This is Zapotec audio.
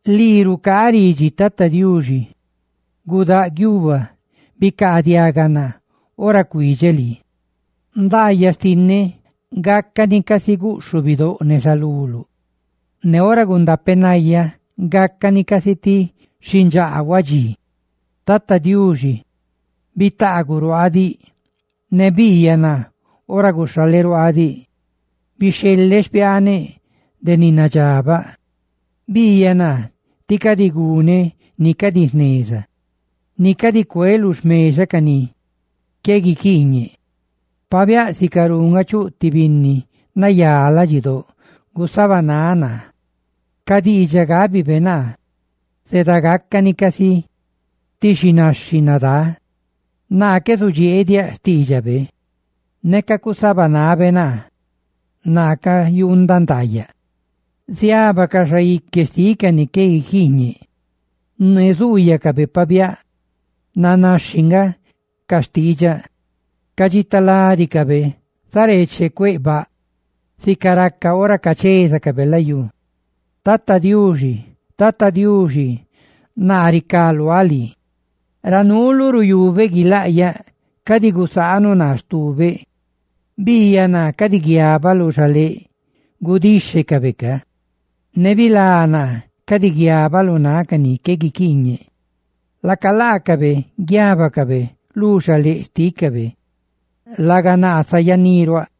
Lii rucaaꞌ ridxi, Tata Diuxi: ¡gudáꞌ guiuba!, ¡bicaadiaga naa ora cuidxeꞌ lii! Ndaayaꞌ xtinneꞌ gácani casi guꞌxhubidóꞌ neza luluꞌ, ne ora gundapenayáꞌ, gácani casi ti xindxaa huadxí. Tata Diuxi, bitaaguꞌ ruaaꞌ diꞌ; ne biiyaꞌ naa ora guxhaleꞌ ruaaꞌ diꞌ. Bixheleꞌ xpiaaneꞌ de ni nadxabaꞌ; biiyaꞌ naa tí cadi guneꞌ ni cadi jneza, ne cadi cueꞌ lu xmexa ca ni qué guiquiiñe. Pabiáꞌ sicarú nga chuꞌ ti binni nayá ladxidóꞌ gusabanáꞌ naa, ca diidxaꞌ gábibe naa zedagaca cani casi ti xinaxhi nadá. Naa qué zudxieeꞌ diaꞌ xtiidxabe; neca cusabanabe naa, naa cayuundaꞌ ndaayaꞌ. Ca xaique xtiꞌ ca ni qué guiquiiñe ziábacaꞌ ruaa bandaa, ne zuuyacabe pabiáꞌ nanaxhi nga ca xtiidxaꞌ. Ca dxitaladicabe zareeche cueꞌ baꞌ, sica raca ora cachézacabe layú. Tata Diuxi, Tata Diuxi, naa ricá luáꞌ lii. Ra nuuluꞌ ruyubeꞌ guilaꞌyaꞌ: cadi gusaanuꞌ naa stubeꞌ. Biiyaꞌ naa cadi guiabaꞌ lu xaléꞌ gudíxhecabe; ne bilá naa cadi guiabaꞌ lu náꞌ ca ni qué guiquiiñe. Laaca laacabe guiábacabe lu xaléꞌ xtícabe, laga naa sayaꞌ niruaꞌ.